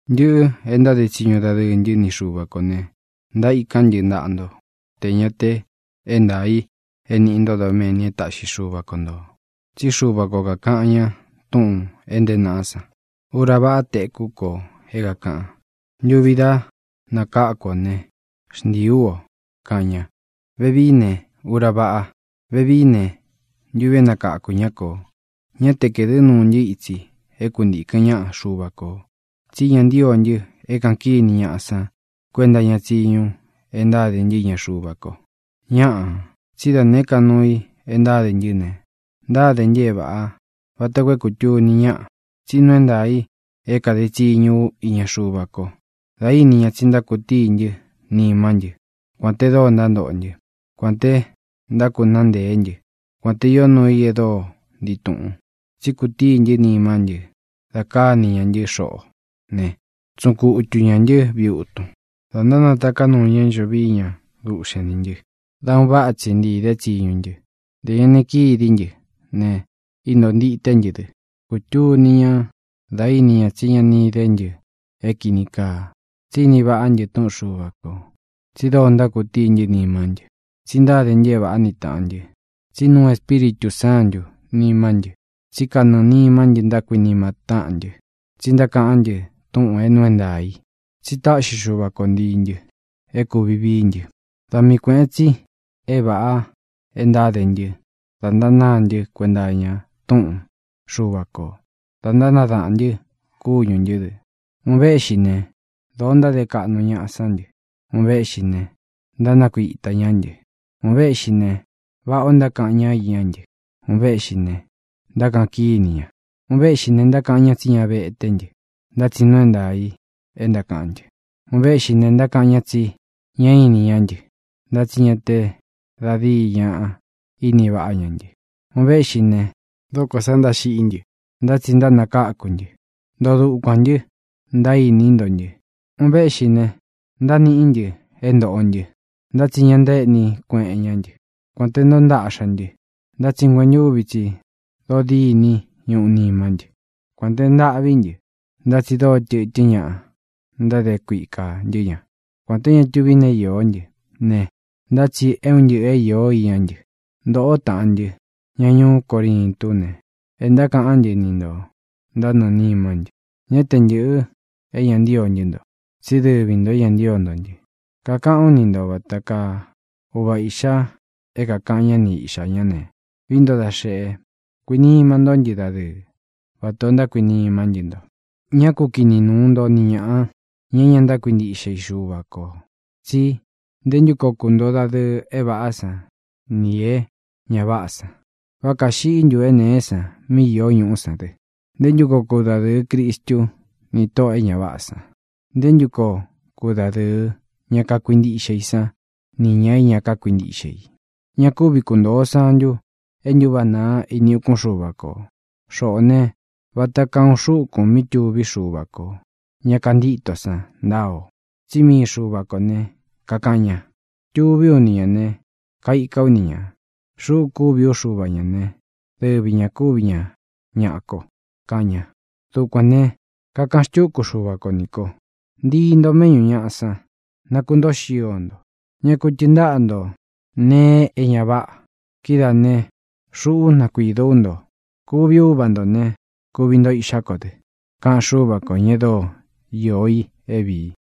Ntɨꞌɨ e ntáde tsiñu dadɨɨ ntɨ́ ni Xuva kō ne, ntaíkán ntɨ ntaꞌa nto tē ña te é ntaā i é nīꞌi ntó doméni e táꞌxi Xuva ko ntō. Tsí Xuva ko kākaꞌan ña túꞌūn é ntēé naꞌá san: Ura váꞌa téku ko é kākaꞌan; ntuvi dá nakáku ú o ne, xntiī ú o, kaꞌan ña. Vevií ne, ura váꞌa; vevií ne, ntuvi é nakakū ñá kō. Ñá te kaēdɨ́ nuu ntɨ́ itsi é kuntīkɨn ñáꞌa Xuva kō, tsí ña ntío ntɨ é kāꞌan kíni ñaꞌa san kuenta iña tsiñu e ntáde ntɨ́ iña Xuva ko. Ñáꞌā, tsí da nēé ka nuu i e ntáde ntɨ́ ne, ntáde ntɨ é vāꞌá vata koo é kūtuni ñáꞌa tsí nuu é ntaā i é kāde tsiñu ú iña Xuva ko da íni ña tsi ntákutíi ntɨ́ nimá ntɨ kuān te dóo ntántoꞌo ntɨ́, kuān te ntákunáa nteé ntɨ, kuān te ió nuu i e dóo ntii tuꞌun. Tsí kutíi ntɨ́ nimá ntɨ da káni ña ntɨ́ xoꞌo ne, tsuꞌun kutu ñā ntɨ́ viꞌi utun, dā nátaká nuu ña é ncho vií ña duꞌxen nī ntɨ́, dā un váꞌa tsi ntiī dé tsiñu ntɨ. Ntē ña ni kidí ntɨ ne, intóo ntité ntɨ dɨ. Kūtuni ñá da íni ña tsí ña ini dé ntɨ é kīni kaa, tsí ini vaꞌá ntɨ túꞌun Xuva kō, tsi dóo ntákutíi ntɨ́ nimá ntɨ, tsi ntáde ntɨ é vāꞌá ni tāꞌan ntɨ́, tsi é nuu Espíritū Sántū nimá ntɨ, tsí kanɨɨ̄ nimá ntɨ ntákuinima táꞌan ntɨ, tsi ntákaꞌán ntɨ túꞌūn é nuu é ntaā í, tsi táꞌxi Xuva ko ntiī ntɨ é kūvi vií ntɨ. Da mii kuēꞌen tsi é vāꞌa e ntáde ntɨ́ da ntánāá ntɨ kuenta iña túꞌun Xuva kō, da ntánadaꞌān ntɨ kúñū ntɨ́ dɨ. Un véꞌxi ne, dōo ntáde kaꞌnu ñaꞌa sán ntɨ; un véꞌxi ne, ntánakuitā ñá ntɨ. Un véꞌxi ne, váꞌā o ntákaꞌan ñá iñá ntɨ; un véꞌxi ne, ntákaꞌan kíni ña. Un véꞌxi ne, ntákaꞌan ña tsí ña veté ntɨ; ntá tsi nuu é ntaā i e ntákaꞌán ntɨ. Un véꞌxi ne, ntákaꞌan ña tsi ñá ini ñá ntɨ; ntá tsi ña te da díi ñaꞌa ini vaꞌá ña ntɨ. Un véꞌxi ne, dókō sa ntáxiꞌí ntɨ; ntá tsi ntánakáku ntɨ́, ntoo dukuān ntɨ, ntaíní nto ntɨ. Un véꞌxi ne, ntániꞌí ntɨ é ntōꞌo ntɨ; ntá tsi ña ntaéꞌní kueꞌen ñá ntɨ. Kuān te ntóo ntaꞌxa ntɨ, ntá tsi nguentúvi tsi dóo diní ñuꞌu nimá ntɨ. Kuān te ntâꞌví ntɨ, ntá tsi dóo tɨ̄tɨ́n ñaꞌa ntáde kuika ntɨ́ ña. Kuān té ña tuví nee īó ntɨ ne, ntá tsi é un ntɨꞌɨ īó iñá ntɨ. Ntōꞌó taꞌan ntɨ́, ña ñuú Corintú ne, e ntákaꞌán ntɨ ni nto ntánɨɨ̄ nimá ntɨ. Ñá te ntɨ̄ꞌɨ é ña ntío ntɨ́ nto, tsí dɨvi ntō é ña ntío nto ntɨ. Kakaꞌán u ni nto vata kaa uva īꞌxa é kākaꞌan ñá ni iꞌxā ñá ne, vií nto da xeꞌe, kuinima ntó ntɨ dadɨɨ vatā o ntákuinimá ntɨ nto. Ñá ku kini nuu nto ni ñāꞌa, ña é ña ntákuintíꞌxe i Xuva kō, tsi ¿nté ntu koo kuntoo dadɨɨ é vāꞌá san nī é ña váꞌā san? ¿Vá kāxiꞌí ntu é nēé san mí īó ñuꞌú san dɨ? ¿Nté ntu koo kudadɨɨ Cristu ni tóꞌō e ña váꞌā san? ¿Nté ntu koo kudadɨɨ ña kakuintiꞌxe i san nī ña é ña kákuintiꞌxe i? Ña kúvi kuntōo santu e ntúváꞌa nāa ini ukún Xuva kō. Xoꞌō ne, vata kaa uun xúkūn mí tuví Xuva kō, ña kantítō san, ntáa ō. Tsí mii Xuva kō ne, kakaꞌan ña: Tuví u ni ñā ne, kaika ú ni ñā; xuꞌú kuvi ú Xuva ñā ne, dɨvi ña kūvi ña ñaꞌa ko, kaꞌan ña. Dukuān ne, kakaꞌan xtúku Xuva ko ni kō: Ntii ntō méꞌñū ñaꞌa san, nakuntóo xio nto; ñá ku tɨɨn ntaꞌa nto nēe é ña váꞌa. Kidáā ne, xuꞌú nakuidó u nto. Kuvi ú Uva ntō ne, kuvi nto iꞌxá ko dɨ, kaꞌan Xúva kō, ña e dóo iō i é vīi.